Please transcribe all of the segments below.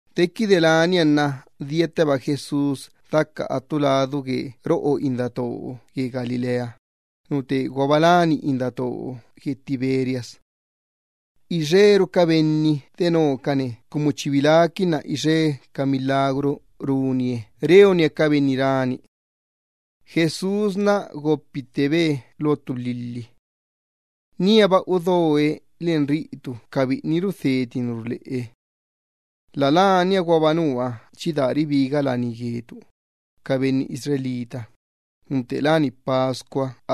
Dequide lania nna diatteba Jesús daca attu ladu gue roꞌo indattoo gue Galilea, nu teeguaba láni indattoo gue Tiberias. Ixeru ca benni denocane cumu chi biláquinna ixe ca milagru runie reonie ca benni rani. Jesús gopittebe lo ttu lhilhi. Níaba udoe len ca biꞌini rudheti ca tisa ruleꞌe. La lania guaba nua chi daa ribiga laní gue ca benni Israel, lá Pascua.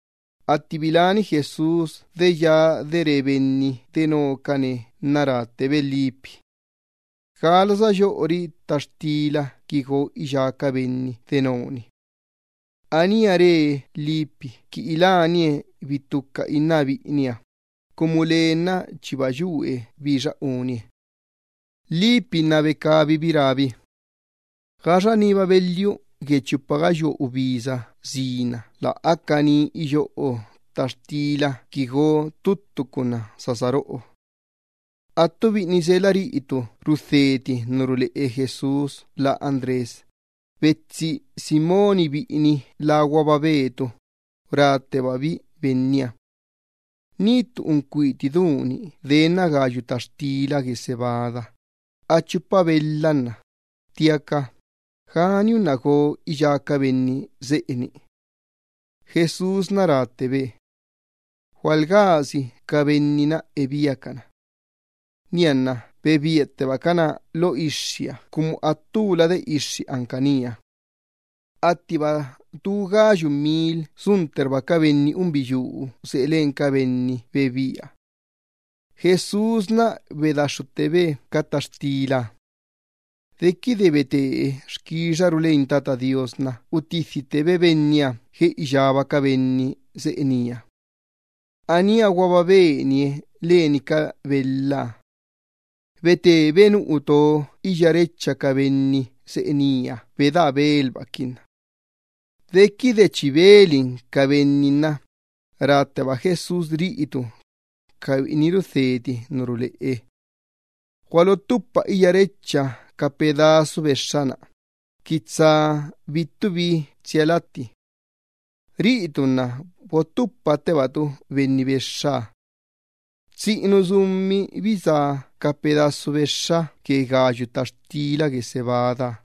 Atti biláni Jesús de ya de re benni denocane nna ráttebe Felipe: —¿Gala sayoꞌori ttaxtila qui go iyá ca benni deno-ni? Aníaba re Felipe qui ilánie bittuca inná biꞌiniha, cumu lee nna chiba yue bixa unie. Felipe nna becabibi rábi: —Gaxa niba belhiu gue chupa gayua ubisa sina lä aca ni qui iyoꞌo ttaxtila go ttuttu ca unná sa saroꞌo. Attu biꞌini rudheti ca tisa ruleꞌe Jesús lá Andrés, betsi Simón biꞌini láguaba Pedro, ráttebabi Benniha: —Ni ttu uncuiti du-ni denna gayu ttaxtila gue cebada, a chupa belha nna, ttiaca ¿gani unná go iyá ca benni seꞌe-ni? Jesús ráttebe: —Gualgási iyáxea ca benni seꞌe-na ebíacana. Nianna, bebíattebacana lo ixxiha cumu attulade ixxi anca nía. Attiba tu gayu mil suntterba ca benni unbiyuu seꞌe len ca benni bebíaha. Jesús bedaxxuttebe ca ttaxtilaha. Dequide betee xquixaru leni Tata Do Iyyabaaha nna utidhittebe benniha gue iyába ca benni seꞌe nía. Aníaguaba benie len ca belhaha. Betebe nu uto iyárecha ca benni seꞌe nía bedaa belbaquinna. Dequide chi belin ca benni nna rátteba Jesús ca biꞌini rudheti ca tisa ruleꞌe: —Gualottupa iyárecha ca pedazu bexxa-na, qui tsa bittubi tsia latti. Riꞌitu nna bottupattebatu benni bexxaha. Tsiꞌinu sumi bisá ca pedazu bexxa gue gayu ttaxtila gue cebadaha.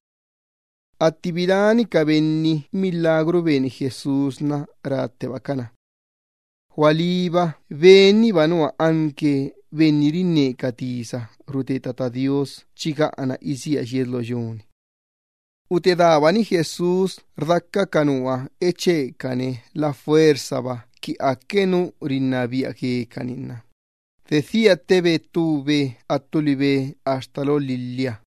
Atti biláni ca benni milagru beni Jesús, ráttebacana: —Gualíba Benniba nua profeta chi gaꞌana isía yies lo yu-ni. Utedaabani Jesús rdaca ca nua echecane la fuerzaba qui aque nu rinnabia guecani nna, dedhiattebe ttube attu libe axta lo lhilhiha.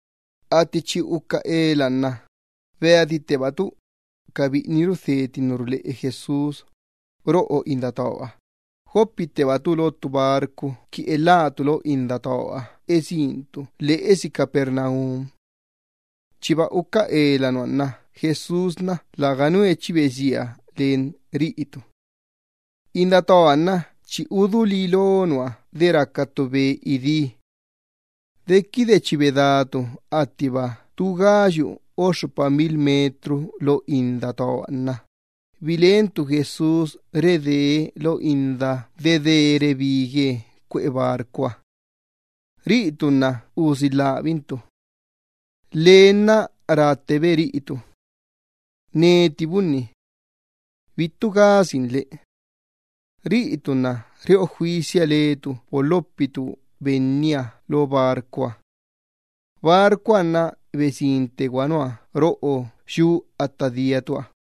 Atti chi uca ela nna beaditteba ca biꞌini rudheti ca tisa ruleꞌe Jesús, roꞌo indattooha, gopittebacabi lo ttu barco qui elhácabi lo indattooha esíncabi lheꞌesi Capernaum. Chiba uca ela nua nna Jesús läganue chi besina len ca biꞌiniha. Indattooha nna chi udulí lo nua de raca ttu be idí. Dequide chi bedácabi attiba tu gayu o xxupa kilómetro lo indattooha nna, biláquinbi Jesús ridee lo indaha dedee rebigue cuꞌe barcoha, lacabi nna usilhabaquinbi. Lee nna unnettebe re ca biꞌiniha: —Neti bunni. ¡Bittu gasinle! Lacabi nna reꞌo juisia lecabi bolhopicabi Benniha lo barcoha. Barcoha nna besinttegua nua roꞌo yu atta diacabiha.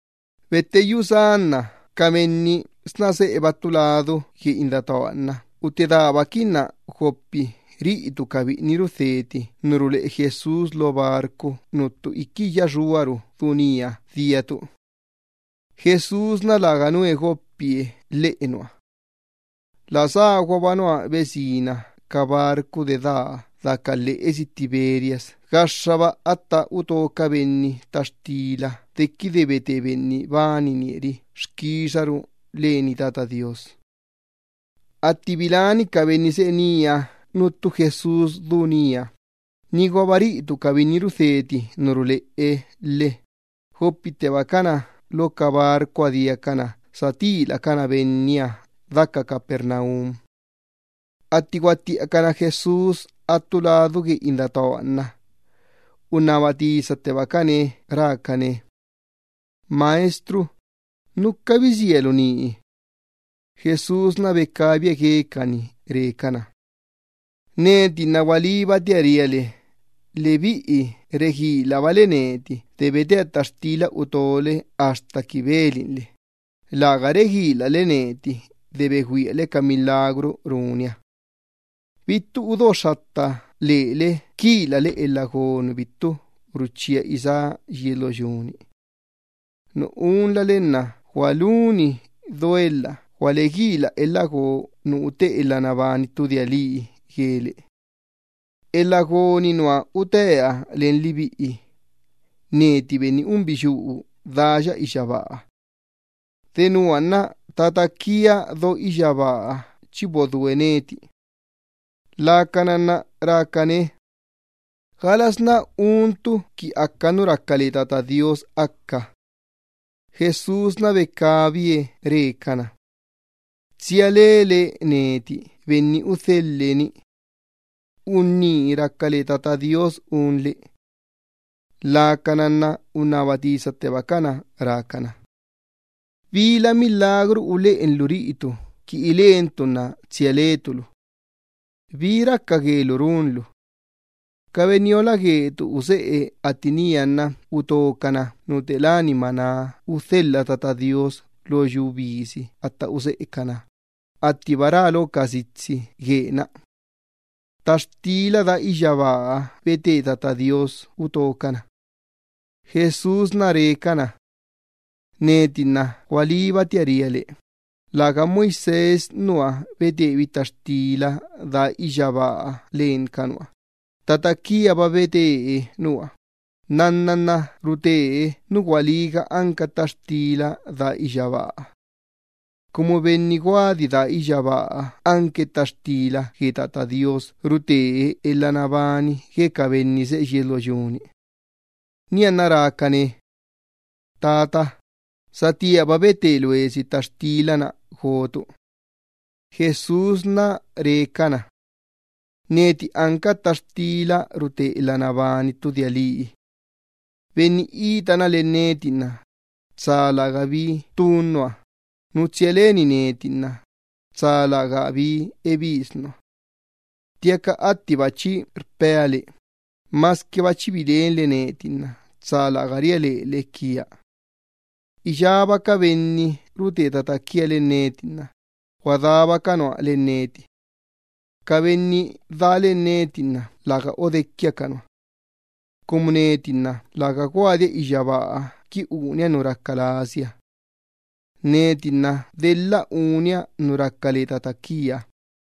Betteyú sá nna ca benni sna seꞌeba ttu ladu gue indattooha nna utedaabaquinna gopi ca biꞌini rudheti ca tisa ruleꞌe Jesús lo barco nuttu iqui iyya xuaru du nía diacabi. Jesús läganue gopi lheꞌe nua. La ságuaba nua besina ca barco dedaa daca lheꞌesi Tiberias gaxxaba atta uto ca benni ttaxtila dequide bete Benni bananie ri-na xquixaru leni Tata Do Iyyabaaha. Atti biláni ca benni seꞌe nía nuttu Jesús du nía, niguaba ca biꞌini rudheti ca tisa ruleꞌe lhe, gopittebacana lo ca barcoha diacana satilacana Benniha daca Capernaum. Atti guattiꞌacana Jesús attu ladu gue indattooha nna, unnaba tisattebacane rácane: —Maestro, ¿núca bisíalu nii? Jesús becabie guecani re cana: —Neti nna gualíbatia ria le, lebiꞌi reguilabale neti de betea ttaxtila utole axta qui belinle, läga reguilale neti de begüiale ca milagru runia. Bittu udoxxatta lele quilale elha go nu bittu ruchía isá yies lo yu-ni. Nu unlale nna gualuni duelha gualeguila elha go nu ute elha nabani ttu dia lii guele. Elha go-ni nua utea len lebiꞌi, neti Benni unbiyuu daa iyyabaaha. Denua nna Tata quia do iyyabaaha chi bodúe neti. Lacana nna rácane: —¿Galasná untu qui aca nu raca le Tata Do Iyyabaaha aca? Jesús becabie re cana: —Tsia lele neti Benni udhelhe ni. Unní raca le Tata Do Iyyabaaha unle. Lacana nna unnaba tisattebacana rácana: —¿Bila milagru uleꞌenlu riꞌitu qui ilentu nna tsia letu lu? ¿Bi raca guelu runlu? Ca benniola guetu useꞌe atti nía nna utocana nu te láni maná udhelha Tata Do Iyyabaaha lo yu bisi atta useꞌecanaha, attiba rá lo ca sitsi guee-na: “Ttaxtila daa iyyabaaha bete Tata Do Iyyabaaha utocana.” Jesús becabie re cana: —Neti nna gualíbatia ria le, läga Moisés nua betebi ttaxtila daa iyyabaaha len ca nua, Tata quiaba bete nua, nnanna nna rute nu gualíga anca ttaxtila daa iyyabaaha. Cumu netiba nua goadia iyyabaaha anca ttaxtila gue Tata Do Iyyabaaha rutea elha nabani gue ca benni seꞌe yies lo yu-ni. Nianna rácane: —Tata, satíaba bete loesi ttaxtila-na gotu. Jesús re cana: —Neti anca ttaxtila rute elha nabani ttu dia lii. Benni itana len neti nna tsa lärgabi ttun nua, nu tsia leni neti nna tsa lärgabi ebis nua. Ttiaca attiba chi rpea le, masquiba chi bilenle neti nna tsa läga ria lele quia. Iyába ca benni rute tata quia len neti nna guadába ca nua len neti. Ca benni daa len neti nna läga odequia ca nua. Cumu neti nna läga guadia iyyabaaha qui unia nu raca lasia. Neti nna delha unia nu raca le Tata quia.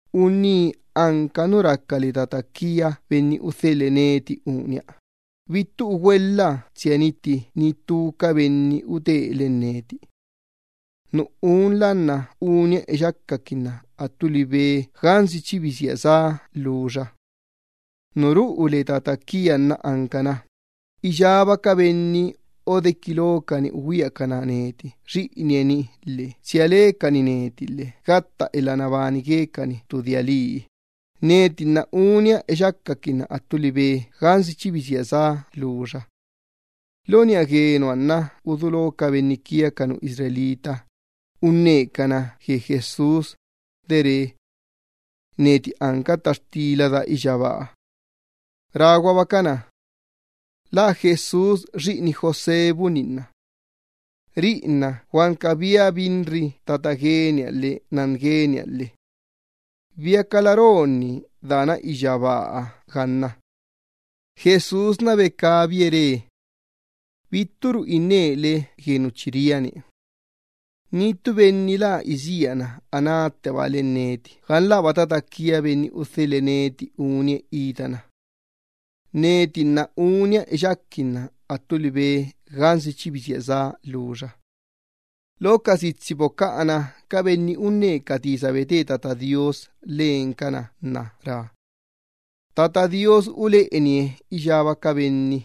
Unní anca nu raca le Tata quia Benni udhelhe neti unia, bittu ugüelha tsia nitti ni ttu ca benni utee len neti. Nu unla nna unia eyacaquinna attu libe gansi chi bisía sá lhuxa. Nu ruꞌu le Tata quia nna ancana, iyába ca benni odequi locani ugüiacana neti Xiꞌinie-ni, tsia lecani neti lhe ca unnuha gatta elha nabani guecani ttu dia lii, neti nna unia eyacaquinna attu libe gansi chi bisía sá lhuxa. Lo niꞌa gue nua nna udulo ca benni Israel unnecana gue Jesús, de rá Benniha: “Neti anca ttaxtila daa iyyabaaha.” Ráguabacana: —¿Lä Jesús xiꞌini José bunni nna? Riꞌi nna guanca biabinri tata gueniha lhe nan gueniha lhe. ¿Biacala rá unní dequi dana iyyabaaha ganna? Jesús becabie re: —Bitturu innele gue nu chi ria-ni. Ni ttu benni lä isíana anátteba len neti gan läba Tata quia Benni udhelhe neti unie itana. Neti nna unia eyaquinna attu libe gansi chi bisía sá lhuxa. Lo ca sitsi bocaꞌa ca profeta nna rá: “Tata Do Iyyabaaha uleꞌenie iyába ca benni.”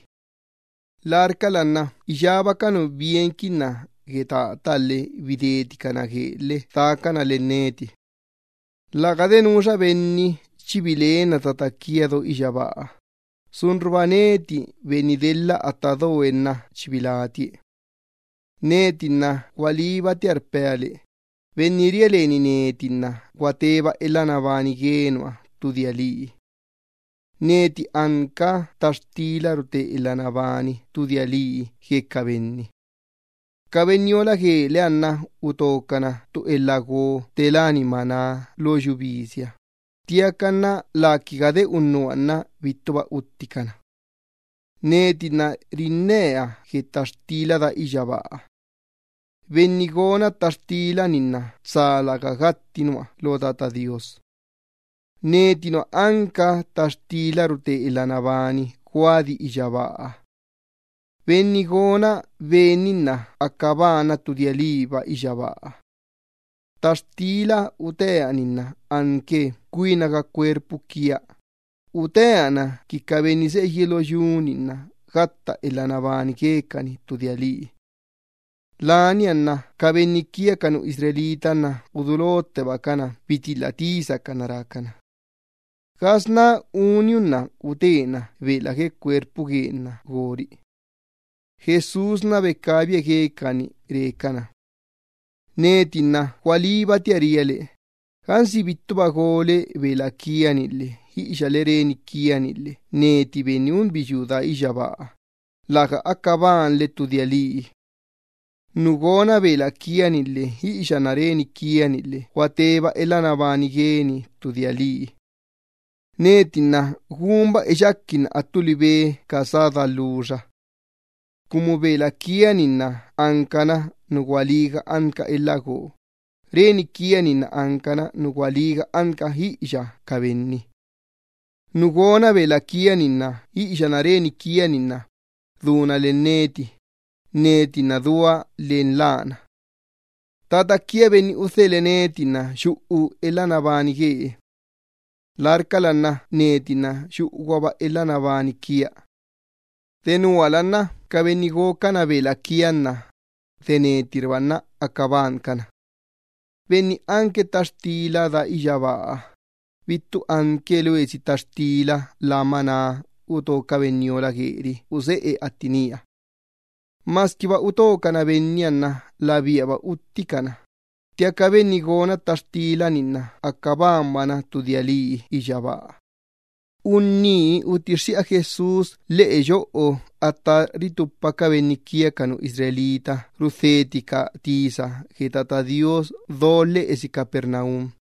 Larcala nna iyába ca nu bienquinna gue Tataha lhe bideticana guee lhe dacana len neti. ’Tsa läganu chi bilenna Tata quia do iyyabaaha, sunruba neti Benni delha atta doe chi bilátie. Neti nna gualíbatia rpea le, benni ria leni neti nna gua teba elha nabani gue nua ttu dia lii. Neti anca ttaxtila rute elha nabani ttu dia lii gue ca benni. Ca benniola gueleha nna utocana ttu elha go te láni maná lo yu bisiha, ttiaca läquiga de unnuha nna bittuba utticana. Neti nna rinnea gue ttaxtila daa iyyabaaha. Benni gona ttaxtila-ni nna tsa läga gatti nua lo Tata Do Iyyabaaha. Neti nua anca ttaxtila rute elha nabani guadi iyyabaaha. Benni gona ben-ni nna aca banna ttu dia liiba iyyabaaha. Ttaxtila utea-ni nna anque cuinaga cuerpu quia, utea na qui ca benni seꞌe yies lo yu-ni nna gatta elha nabani guecani ttu dia lii. Lania nna ca benni Israel nna udulottebacana bitilha tisacana rácana: —¿Gasná uniunná utena bela gue cuerpu guen-na gori? Jesús becabie guecani re cana: —Neti nna gualíbatia ria le, gansi bittuba gole bela quia-ni lhe iꞌiyale reni quia-ni lhe neti Benni unbiyuu daa iyyabaaha, läga aca banle ttu dia lii. Nu gona bela quia-ni lhe iꞌiyana reni quia-ni lhe gua teba elha nabani gueni ttu dia lii. Neti nna gunba eyaquinna attu libe ca sá daa lhuxa. Cumu bela quia-ni nna ancana nu gualíga anca elha go, reni quia-ni nna ancana nu gualíga anca iꞌiya ca benni. Nu gona bela quia-ni lhe iꞌiyana reni quia-ni lhe unnuha duna len neti, neti nna dua len lana. Tata quia Benni udhelhe neti nna yuꞌu elha nabani guee. Larcala nna neti nna yuꞌuguaba elha nabani quia. Denuala nna ca benni gocana bela quia-ni, de netirba nna aca bancana. Benni anque ttaxtila daa iyyabaaha, bittu anque loesi ttaxtila lá maná uto ca benniola gueri useꞌe atti nía. Masquiba utocana benniha nna labíaba utticana, ttiaca benni gona ttaxtila-ni nna aca banbana ttu dia lii iyyabaaha. Unní utixxiꞌa Jesús lheꞌe yoꞌo atta ritupa ca benni Israel rudheticana ca tisa gue Tata Do Iyyabaaha do lheꞌesi Capernaum.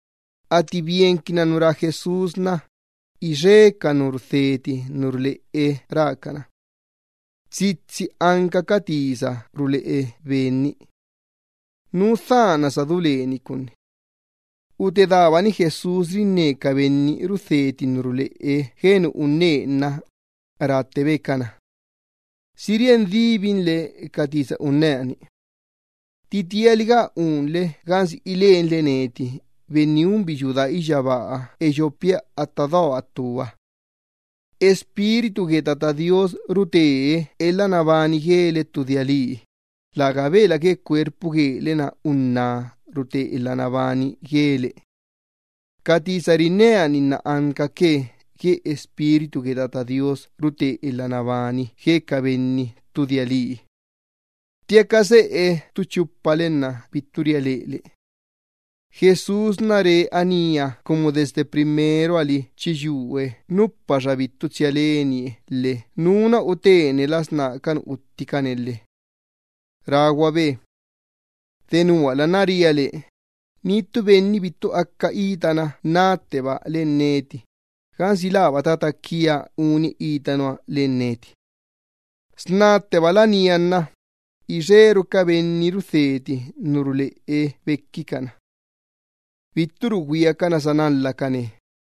Atti bienquinna nu rá Jesús, ixe ca nu rudheti ca tisa ruleꞌe rácana: —Tsitsi anca ca tisa ruleꞌe Ben-ni. ¿Nú dhana udo nagani gue Ben-ni? Utedaabani Jesús rinne ca biꞌini rudheti ca tisa ruleꞌe gue nu unnee nna, ráttebe cana: —¿Si rien díbinle ca tisa unnea-ni? ¿Titialiga unle gansi ilenle neti Benni unbiyuu daa iyyabaaha eyopia atta doa ttuha? Espíritu gue Tata Do Iyyabaaha rute elha nabani guele ttu dia lii, läga bela gue cuerpu guele-na unná rute elha nabani guele. Ca tisa rinnea-ni nna ancaque gue Espíritu gue Tata Do Iyyabaaha rute elha nabani gue ca benni ttu dia lii. Ttiaca seꞌe ttu chupale nna bittu ria lele. Jesús re anía cumu desde primeroha li chi yue nupaxa bittu tsia lenie lhe nú nua utene las ná ca nu utticane lhe. Ráguabe: —Denuala nna ria le, ni ttu benni bittu aca itana natteba len neti, gansi läba Tata quia unie ita nua len neti. Snatteba lania nna ixeru ca benni rudheti ca tisa ruleꞌe bequicana, bitturu güiacana sanalhacane.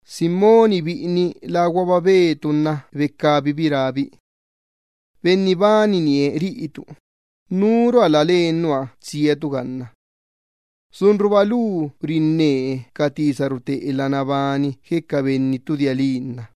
Simón biꞌini láguaba Pedro nna becabibi rábi: —Benni bananie riꞌitu, ¿núrua la len nua tsiatu ganna? Inqui sunruba lu rinne ca tisa rute elha nabani gatta ttu dia lii gue ca benni nna.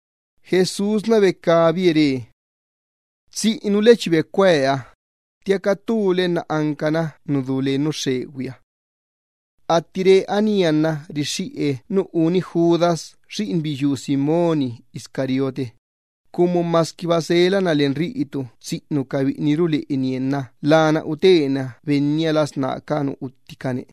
Jesús becabie re: —Tsiꞌinule chi becueea, ttiaca ttule nna ancana ttu nu xxegüi. Atti re anía nna rixxiꞌe nu uni Judas xiꞌinbiyuu Simón Iscariote, cumu masquiba selana len tsiꞌinu ca biꞌini rudheti ca tisa ruleꞌe Benniha nna lana utena Benniha las ná ca nu utticane.